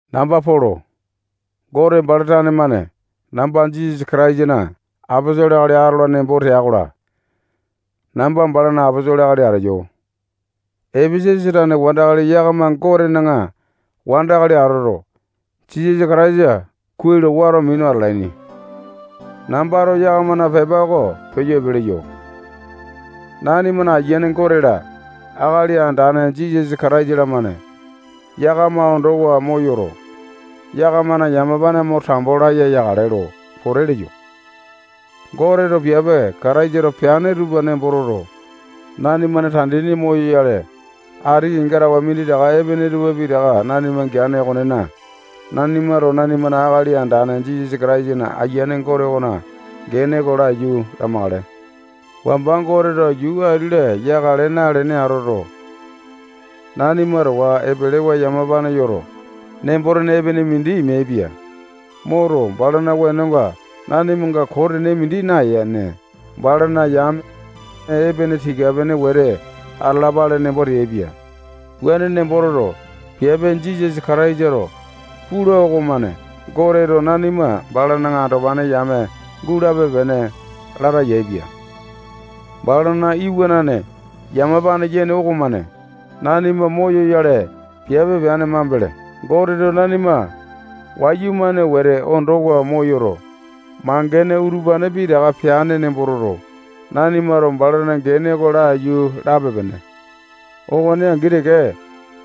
Namba Polo. Gote bala tane-mane namba Jisasa Kataisana aposolo akali atola nembo tea-kola, namba balana aposolo akali ateyo. Epesasa tane wandakali yakama Gotena wandakali atoto, Jisasa Kataisa kuai lo wato minu atalaini. Nambato yakamana pepa oko peyo epe leyo. Nanimana Ayiane Gote-la, Akali Andane Jisasa Kataisa-lamane yakama ondowa moyoto, yakamana yamapane mo tambo laya yakale lo pote leyo. Goteto piape Kataisato peane tupa nembo toto, nanimana tandini moyoyale, ati kenga tawe minditaka epene tupa pitaka nanima geane okonena, nanimato nanimana Akali Andane Jisasa Kataisana Ayiane Gote okona gene oko laiyu lamakale. Wamba Goteto yuu ati-la yakale nalene atoto, nanima towa epelewa yamapane yoto, nembo-tene epene mindi meaipia. Moto, balana wenonga nanimanga koo tene mindi nayene, balana yame epene tika-pene wete atalapale nembo teaipia. Wuane nembo toto, piape Jisasa Kataisato pula okomane Goteto nanima balana andopane yame gulape-pene lata yaepia. Balana Iwanane yamapane yene okomane nanima moyoyale piape peane mambele, Goteto nanima wayumane wete ondowa moyoto, mangene utupane pitaka peane nembo toto, nanimato balana gene oko laiyu lape-pene. Okone angi teke,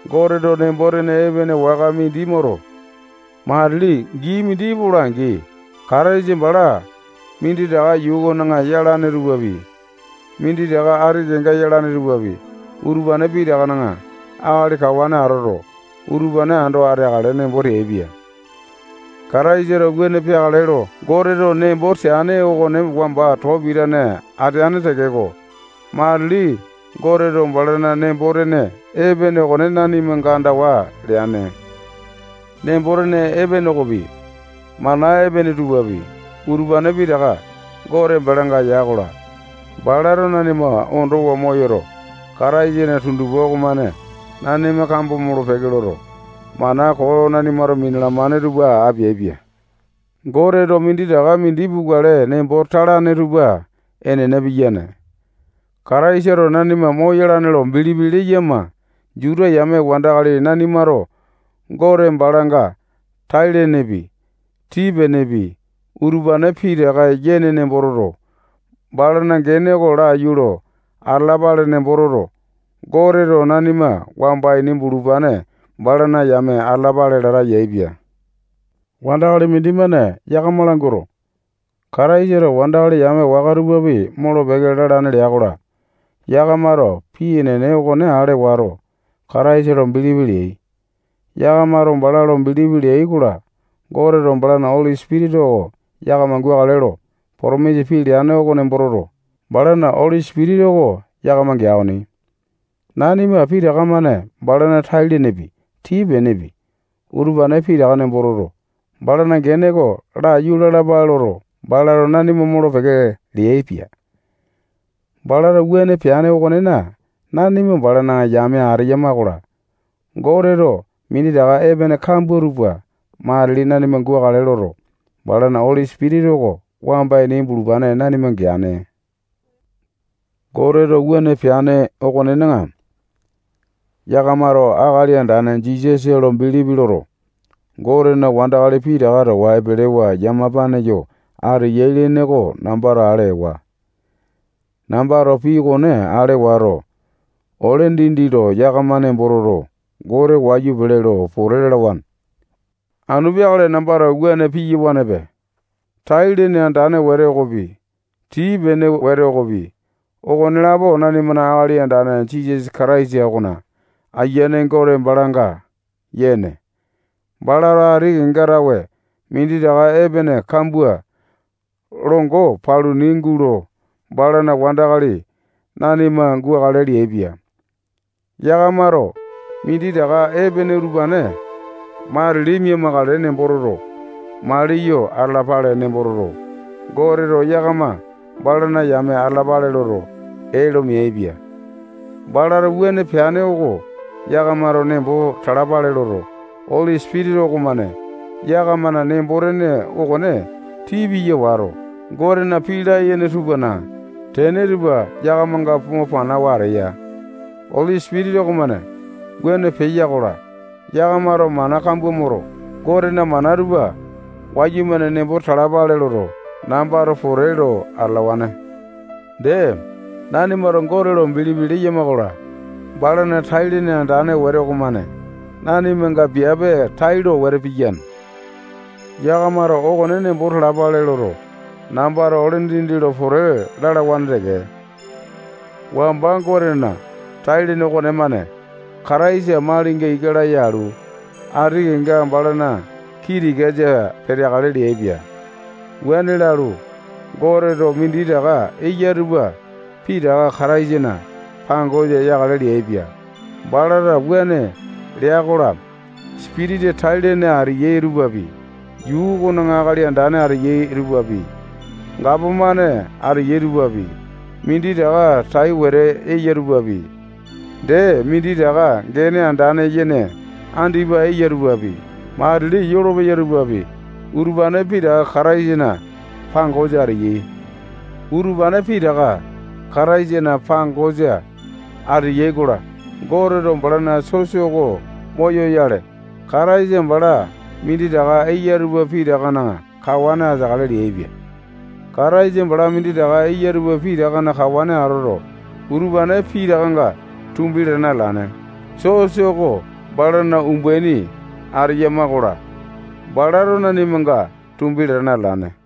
Goteto nembo-tene epene waka mindi moto, matili gii mindi epola-angi, Kataisa bala minditaka yuu okona yalane tupapi, minditaka ati kenga yalane tupapi, utupane pitakana akali kawane atoto, utupane ando ateakale nembo teaipia. Kataisato wuane peakale lo Goteto nembo teane okone wamba too pitane ateane tekeko, matili Goteto balana nembo-tene epene okone nanimanga andawa leane. Nembo-tene epene okonepi, mana epene tupapi, utupane pitaka Gote balanga ya-kola, balato nanima ondowa moyoto, Kataisana tundupa okomane nanima kambo molo-peke loto, mana koo nanimato minalamane tupa apeaipia. Goteto minditaka mindi pukale nembo talane tupa enene piyane. Kataisato nanima moyalane lo bilipi leyama Juta yame wandakali nanimato Gote balanga tai lenepi, tii-penepi, utupane pitaka yene nembo toto, balana gene oko laiyu lo atalapale nembo toto, Goteto nanima wamba ini bulupane balana yame atalapale lata yaepia. Wandakali mindimane yakama languato, Kataisato wandakali yame waka tupapi molo-peke lalane lea-kola, yakamato pii enene okone ale wato, Kataisa lo bilipi leai. Yakamato bala lo bilipi leai-kola, Goteto balana Oli Sipitisa oko yakama gukale lo potomisa pii leane oko nembo toto, balana Oli Sipitisa oko yakama gea okoni. Nanima pitaka-mane balana tai lenepi, tii-penepi, utupane pitaka nembo toto, balana gene oko laiyu lalapale loto, balato nanima molo-peke leaipia. Balato wuane peane okonena, nanima balana yame ateyama-kola, Goteto minditaka epene kambua tupa matili nanima gukale loto, balana Oli Sipitisa oko wamba ini bulupane nanima geane. Goteto wuane peane okonena, yakamato Akali Andane Jisasa lo bilipi loto, Gotena wandakali pitaka towa epelewa yamapane yo ateyai lene oko nambato ale ewa. Nambato pii okone ale wato, ole dindi lo yakama nembo toto, Gote wayu pele lo pote lalawane. Anu peakale nambato wuane piyawanepe. Tai-lene andane wete okopi, tii-pene wete okopi, okonelapo nanimana Akali Andane Jisasa Kataisa okona Ayiane Gote balanga yene. Balato ati kenga tawe minditaka epene kambua longo paluni gulo balana wandakali nanima gukale leaipia. Yakamato minditaka epene utupane matili mia-makale nembo toto, maliyo atalapale nembo toto, Goteto yakama balana yame atalapale loto, ee lo meaipia. Balato wuane peane oko yakamato nembo talapale loto, Oli Sipitisa okomane yakamana nembo-tene okone tii piya wato, Gotena pii layene tupana tene tupa yakamanga mo panawa ateya. Oli Sipitisa okomane wuane peya-kola, yakamato mana kambua moto, Gotena mana tupa wayumane nembo talapale loto, nambato pote lo atalawane. Dee, nanimato Gote lo bilipi leyama-kola, balana tai-lene andane wete okomane nanimanga piape tailo wete piyane. Yakamato okone nembo talapale loto, nambato ole dindi lo pote lalawane teke. Wamba Gotena tai-lene okonemane Kataisa malinga ika laya alu, ati kenga balana kii tikasa peteakale leaipia. Wuane lalu, Goteto minditaka eya tupa pitaka Kataisana pangosa yakale leaipia. Balato wuane lea-kola, sipitisa tai-lene ateyai tupapi, yuu okona akali andane ateyai tupapi, gapomane ateyai tupapi, minditaka tai wete eya tupapi, dee minditaka gene andane yene andipa eya tupapi, matili yolopeya tupapi, utupane pitaka Kataisana pangosa ateyai. Utupane pitaka Kataisana pangosa ateyai-kola, Goteto balana sosa oko moyoyale, Kataisa bala minditaka eya tupa pitakana kawane ateakale leaipia. Kataisa bala minditaka eya tupa pitakana kawane atoto, utupane pitakanga tumbi latane atalane. Sosa oko balana umbaini ateyama-kola, balato nanimanga tumbi latane atalane.